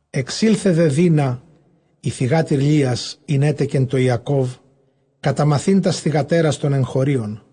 Ἐξῆλθε δὲ Δείνα, ἡ θυγάτηρ Λείας, ἣν ἔτεκε τῷ Ἰακώβ, καταμαθεῖν τὰς θυγατέρας τῶν ἐγχωρίων.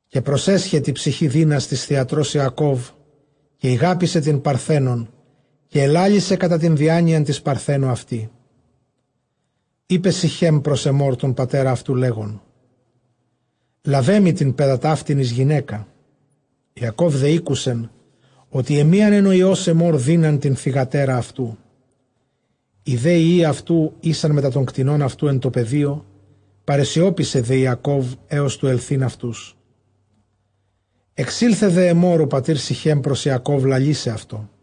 Καὶ προσέσχε τῇ ψυχῇ Δείνας τῆς θυγατρὸς Ἰακώβ· καὶ ἠγάπησε τὴν παρθένον· καὶ ἐλάλησε κατὰ τὴν διάνοιαν τῆς παρθένου αυτῇ. Εἶπε Συχὲμ πρὸς Ἐμμὼρ τὸν πατέρα αὐτοῦ, λέγων, λάβε μοι τὴν παῖδα ταύτην εἰς γυναῖκα. Ἰακὼβ δὲ ἤκουσεν, ὅτι ἐμίανεν ὁ υἱὸς Ἐμμὼρ Δείναν τὴν θυγατέρα αὐτοῦ· οἱ δὲ υἱοὶ αὐτοῦ ἦσαν μετὰ τῶν κτηνῶν αὐτοῦ ἐν τῷ πεδίῳ· παρεσιώπησε δὲ Ἰακὼβ, ἕως τοῦ ἐλθεῖν αὐτούς. Ἐξῆλθε δὲ Ἐμμὼρ ὁ πατὴρ Συχὲμ πρὸς Ἰακὼβ, λαλῆσαι αὐτῷ.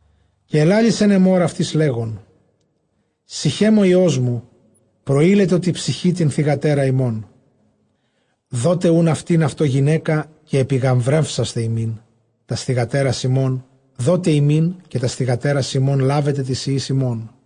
Καὶ ἐλάλησεν Ἐμμὼρ αὐτοῖς, λέγων, Συχὲμ ὁ υἱός μου προείλετο τῇ ψυχῇ τὴν θυγατέρα ὑμῶν· δότε οὖν αὐτὴν αὐτῷ γυναῖκα, καὶ ἐπιγαμβρεύσασθε ἡμῖν· τὰς θυγατέρας ὑμῶν δότε ἡμῖν, καὶ τὰς θυγατέρας ἡμῶν λάβετε τοῖς υἱοῖς ὑμῶν.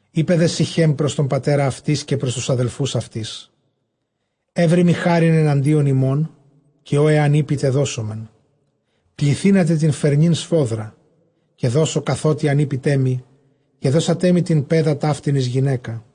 Εἶπε δὲ Συχὲμ πρὸς τὸν πατέρα αὐτῆς, καὶ πρὸς τοὺς ἀδελφοὺς αὐτῆς, εὕροιμι χάριν ἐναντίον ὑμῶν· καὶ ὃ ἐὰν εἴπητε, δώσομεν. Πληθύνατε τὴν φερνὴν σφόδρα, καὶ δώσω καθότι ἂν εἴπητέ μοι, καὶ δώσετέ μοι τὴν παῖδα ταύτην εἰς γυναῖκα.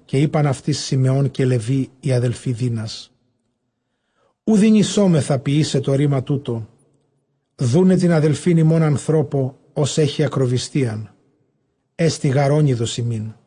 Καὶ εἶπαν αὐτοῖς Συμεὼν καὶ Λευὶ οἱ ἀδελφοὶ Δείνας, οὐ δυνησόμεθα ποιῆσαι τὸ ῥῆμα τοῦτο, δοῦναι τὴν ἀδελφὴν ἡμῶν ἀνθρώπῳ, ὃς ἔχει ἀκροβυστίαν· ἔστι γὰρ ὄνειδος ἡμῖν.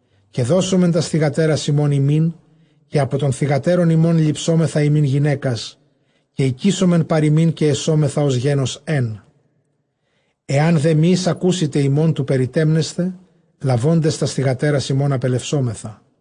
Καὶ δώσομεν τὰς θυγατέρας ἡμῶν ὑμῖν, καὶ ἀπὸ τῶν θυγατέρων ὑμῶν ληψόμεθα ἡμῖν γυναῖκας, καὶ οἰκήσομεν παρʼ ὑμῖν, καὶ ἐσόμεθα ὡς γένος ἕν. Ἐὰν δὲ μὴ εἰσακούσητε ἡμῶν τοῦ περιτεμέσθαι, λαβόντες τὴν θυγατέρα ἡμῶν ἀπελευσόμεθα.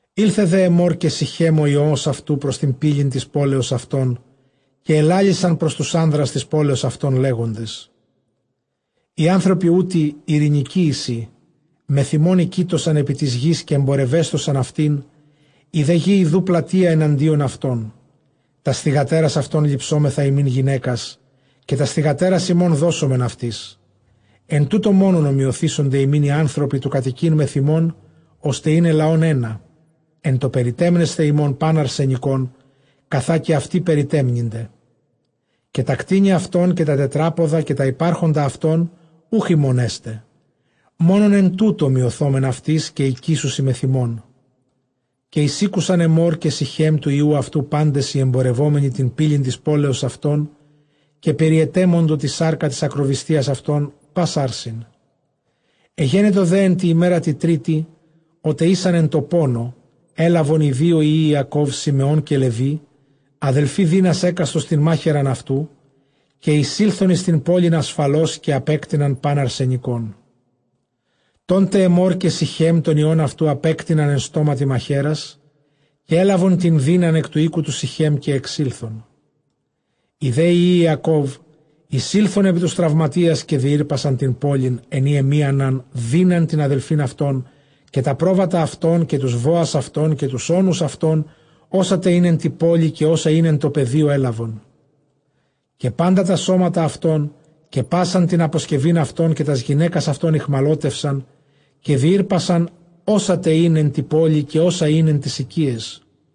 Ἦλθε δὲ Ἐμμὼρ καὶ Συχὲμ ὁ υἱὸς αὐτοῦ πρὸς τὴν πύλην τῆς πόλεως αὐτῶν, καὶ ἐλάλησαν πρὸς τοὺς ἄνδρας τῆς πόλεως αὐτῶν, λέγοντες, Οἱ ἄνθρωποι οὗτοι εἰρήνικοί εἰσι, μεθʼ ἡμῶν οἰκείτωσαν επὶ τῆς γῆς, καὶ ἐμπορευέσθωσαν αὐτήν· ἡ δὲ γῆ ἰδοὺ πλατεῖα ἐναντίον αὐτῶν· τὰς θυγατέρας αὐτῶν ληψόμεθα ἡμῖν γυναῖκας, καὶ τὰς θυγατέρας ἡμῶν δώσομεν αὐτοῖς. Ἐν τούτῳ μόνον ὁμοιωθήσονται ἡμῖν οἱ ἄνθρωποι τοῦ κατοικεῖν μεθʼ ἡμῶν, ὥστε εἶναι λαὸν ἕνα, ἐν τῷ περιτεμέσθαι ἡμῶν πᾶν ἀρσενικὸν, καθὰ καὶ αὐτοὶ περιτέτμηνται. Καὶ τὰ κτήνη αὐτῶν, καὶ τὰ τετράποδα, καὶ τὰ ὑπάρχοντα αὐτῶν, οὐχ ἡμῶν ἔσται; μόνον ἐν τούτῳ ὁμοιωθῶμεν αὐτοῖς, καὶ οἰκήσουσι μεθʼ ἡμῶν. Καὶ εἰσήκουσαν Ἐμμὼρ καὶ Συχὲμ τοῦ υἱοῦ αὐτοῦ πάντες οἱ ἐμπορευόμενοι τὴν πύλην τῆς πόλεως αὐτῶν· καὶ περιετέμοντο τὴν σάρκα τῆς ἀκροβυστίας αὐτῶν πᾶς ἄρσην. Ἐγένετο δὲ ἐν τῇ ἡμέρᾳ τῇ τρίτῃ, ὅτε ἦσαν ἐν τῷ πόνῳ, ἔλαβον οἱ δύο υἱοὶ Ἰακὼβ Συμεὼν καὶ Λευὶ, ἀδελφοὶ Δείνας, ἕκαστος τὴν μάχαιραν αὐτοῦ, καὶ εἰσῆλθον εἰς τὴν πόλιν ἀσφαλὼς, καὶ ἀπέκτειναν πᾶν ἀρσενικόν. Τόν τε Ἐμμὼρ καὶ Συχὲμ τὸν υἱὸν αὐτοῦ ἀπέκτειναν ἐν στόματι μαχαίρας· καὶ ἔλαβον τὴν Δείναν ἐκ τοῦ οἴκου τοῦ Συχὲμ, καὶ ἐξῆλθον. Οἱ δὲ υἱοὶ Ἰακὼβ εἰσῆλθον ἐπὶ τοὺς τραυματίας, καὶ διήρπασαν τὴν πόλιν, ἐν ᾗ ἐμίαναν Δείναν τὴν ἀδελφὴν αὐτῶν. Καὶ τὰ πρόβατα αὐτῶν, καὶ τοὺς βόας αὐτῶν, καὶ τοὺς ὄνους αὐτῶν, ὅσα τε ἦν ἐν τῇ πόλει, καὶ ὅσα ἦν ἐν τῷ πεδίῳ, ἔλαβον. Καὶ πάντα τὰ σώματα αὐτῶν, καὶ πᾶσαν τὴν ἀποσκευὴν αὐτῶν, καὶ τὰς γυναῖκας αὐτῶν ἠχμαλώτευσαν· καὶ διήρπασαν ὅσα τε ἦν ἐν τῇ πόλει, καὶ ὅσα ἦν ἐν ταῖς οἰκίαις.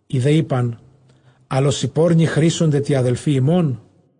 Οἱ δὲ εἶπαν, ἀλλʼ ὡσεὶ πόρνῃ χρήσονται τῇ ἀδελφῇ ἡμῶν;